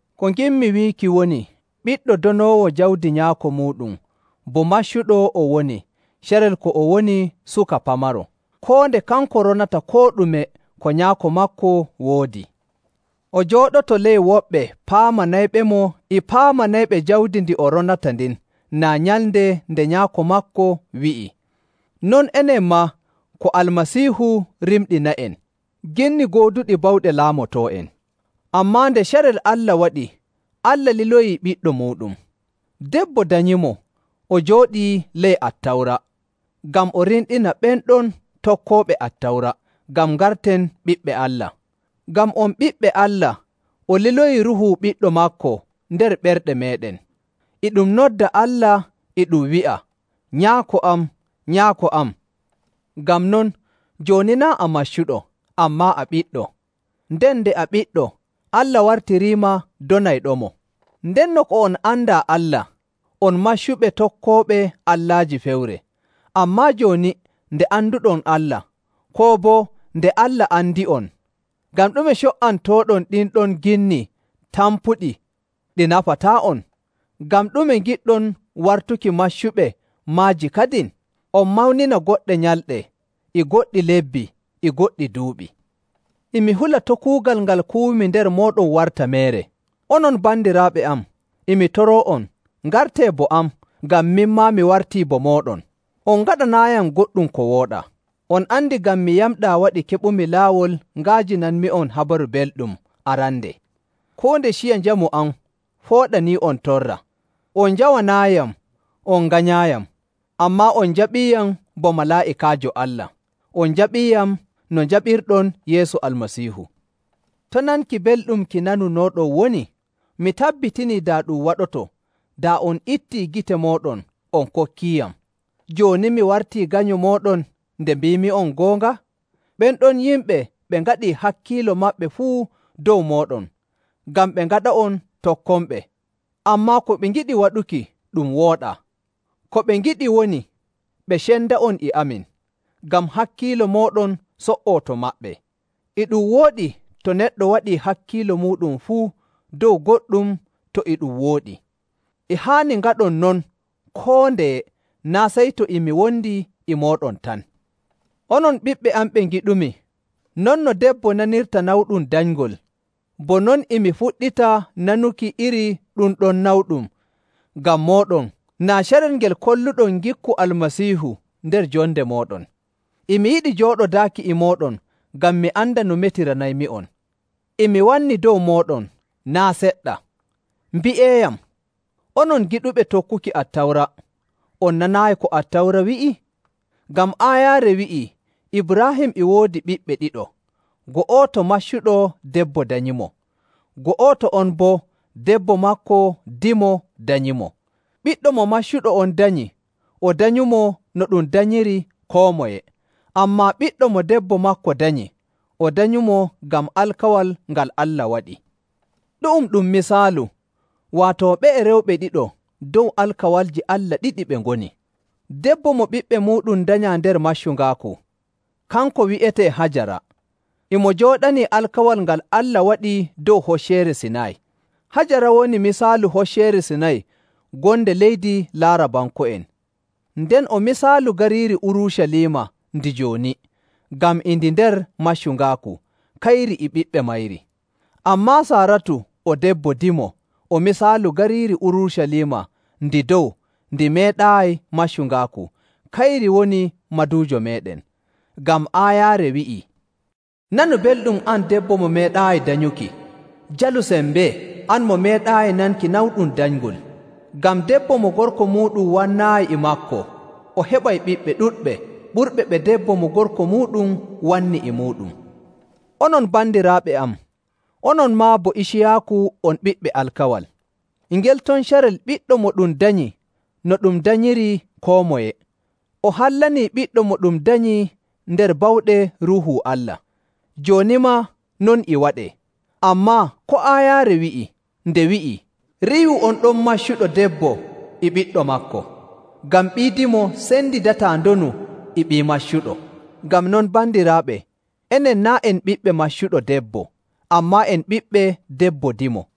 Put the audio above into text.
Ko nginmi wiiki woni ɓiɗɗo donoowo jawdi nyaako muuɗum bo maccuɗo o woni carel ko o woni suka pamaro, koo nde kanko ronata koo ɗume ko nyaako maako woodi. O jooɗoto ley woɓɓe paamanayɓemo e paamanayɓe jawdi ndi o ronata ndin naa nyalnde nde nyaako maako wi'i. Non, enen maa ko Almasiihu rimɗina'en, ginni gooduɗi bawɗe nder laamotoo'en. Ammaa nde carel waɗi, Allah liloyi Ɓiɗɗo muuɗum. Debbo danyimo, o jooɗii ley Attawra, ngam o rimɗina ɓen ɗon tokkooɓe Attawra, ngam ngarten ɓiɓɓe Allah. Ngam on ɓiɓɓe Allah, o liloyi Ruuhu Ɓiɗɗo maako nder ɓerɗe meeɗen, e ɗum nodda Allah e ɗum wi'a, “Nyaako am, Nyaako am.” Ngam non, jooni naa' a maccuɗo, ammaa a ɓiɗɗo. Nden nde a ɓiɗɗo, Allah wartiriima donayɗomo. Ndenno ko on andaa Allah, on maccuɓe tokkooɓe allaaji fewre. Ammaa jooni nde anduɗon Allah, koo boo nde Allah andi'on, ngam ɗume co''antooɗon ɗin ɗon ginni tampuɗi ɗi nafantaa'on? Ngam ɗume ngiɗɗon wartuki maccuɓe maaji kadin? On mawnina goɗɗe nyalɗe, e goɗɗi lebbi, e goɗɗi duuɓi. E mi hula to' kuugal ngal kuwumi nder mooɗon warta meere. Onon bandiraaɓe am, e mi toroo'on, ngartee bo am, ngam min maa mi wartii bo mooɗon. On ngaɗanaayiyam goɗɗum ko wooɗaa. On andi ngam mi yamɗaa waɗi keɓumi laawol nga'ajinanmi'on Habaru Belɗum arande. Koo nde ciya njamu am fooɗanii'on torra, on njawanaayiyam, on nganyaayiyam. Ammaa on njaɓiiyam bo malaa'ikaajo Allah, on njaɓiiyam no njaɓirɗon Yeesu Almasiihu. To nanki belɗum ki nanunooɗon woni? Mi tabbitinii, daa ɗum waɗoto, daa on ittii gite mooɗon on kokkiiyam. Jooni mi wartii ganyo mooɗon nde mbiimi'on goonga? Ɓen ɗon yimɓe ɓe ngaɗii hakkiilo maɓɓe fuu dow mooɗon ngam ɓe ngaɗa'on tokkonɓe, ammaa ko ɓe ngiɗi waɗuki ɗum wooɗaa. Ko ɓe ngiɗi woni ɓe cenda'on e amin, ngam hakkiilo mooɗon so''oo to maɓɓe. E ɗum wooɗi to neɗɗo waɗii hakkiilo muuɗum fuu dow goɗɗum to e ɗum wooɗi. E haani ngaɗon non koo ndeye, naa' sey to e mi wondi e mooɗon tan. Onon ɓiɓɓe am ɓe ngiɗumi, non no debbo nanirta nawɗum danyngol, bo non e mi fuɗɗita nanuki iri ɗum ɗon nawɗum ngam mooɗon naa carel ngel kolluɗon ngikku Almasiihu nder jonde mooɗon. E mi yiɗi jooɗodaaki e mooɗon, ngam mi anda no metiranaymi'on. E mi wanni dow mooɗon naa' seɗɗa! Mbi'eeyam, onon giɗuɓe tokkuki Attawra, on nanaayi ko Attawra wi'i? Ngam aayaare wi'ii Ibraahim e woodi ɓiɓɓe ɗiɗo, go'oto maccuɗo debbo danyimo, go'oto on boo debbo maako dimo danyimo. Ɓiɗɗo mo maccuɗo on danyi, o danyumo no ɗum danyiri koo moye, ammaa ɓiɗɗo mo debbo maako danyi, o danyumo ngam alkawal ngal Allah waɗi. Ɗu'um ɗum misaalu, waato ɓe'e rewɓe ɗiɗo dow alkawalji Allah ɗiɗi ɓe ngoni. Debbo mo ɓiɓɓe muuɗum danyaa nder maccungaaku, kanko wi'etee Hajara, e mo jooɗanii alkawal ngal Allah waɗi dow Hocceere Sinay. Hajara woni misaalu Hocceere Sinay gonde leydi Laarabanko'en, nden o misaalu gariiri Urucaliima ndi jooni, ngam e ndi nder maccungaaku, kayri e ɓiɓɓe mayri. Ammaa Saaratu o debbo dimo o misaalu gariiri Urucaliima ndi dow ndi meeɗaayi maccungaaku, kayri woni maduujo meeɗen. Ngam aayaare wi'ii, “Nanu belɗum an debbo mo meeɗaayi danyuki! Jalu sembee, an mo meeɗaayi nanki nawɗum danyngol! Ngam debbo mo gorko muuɗum wannaayi e maako o heɓay ɓiɓɓe ɗuɗɓe ɓurɓe ɓe debbo mo gorko muuɗum wanni e muuɗum.” Onon bandiraaɓe am, onon maa bo Iciyaaku on ɓiɓɓe alkawal. E ngel ton carel ɓiɗɗo mo ɗum danyi no ɗum danyiri koo moye, o hallanii ɓiɗɗo mo ɗum danyi nder bawɗe Ruuhu Allah. Jooni maa non e waɗee. Ammaa ko aayaare wi'i? Nde wi'i, “Riiwu on ɗon maccuɗo debbo e ɓiɗɗo maako, ngam ɓii dimo sendidataa ndonu e ɓii maccuɗo.” Ngam non bandiraaɓe, enen naa' en ɓiɓɓe maccuɗo debbo, ammaa en ɓiɓɓe debbo dimo.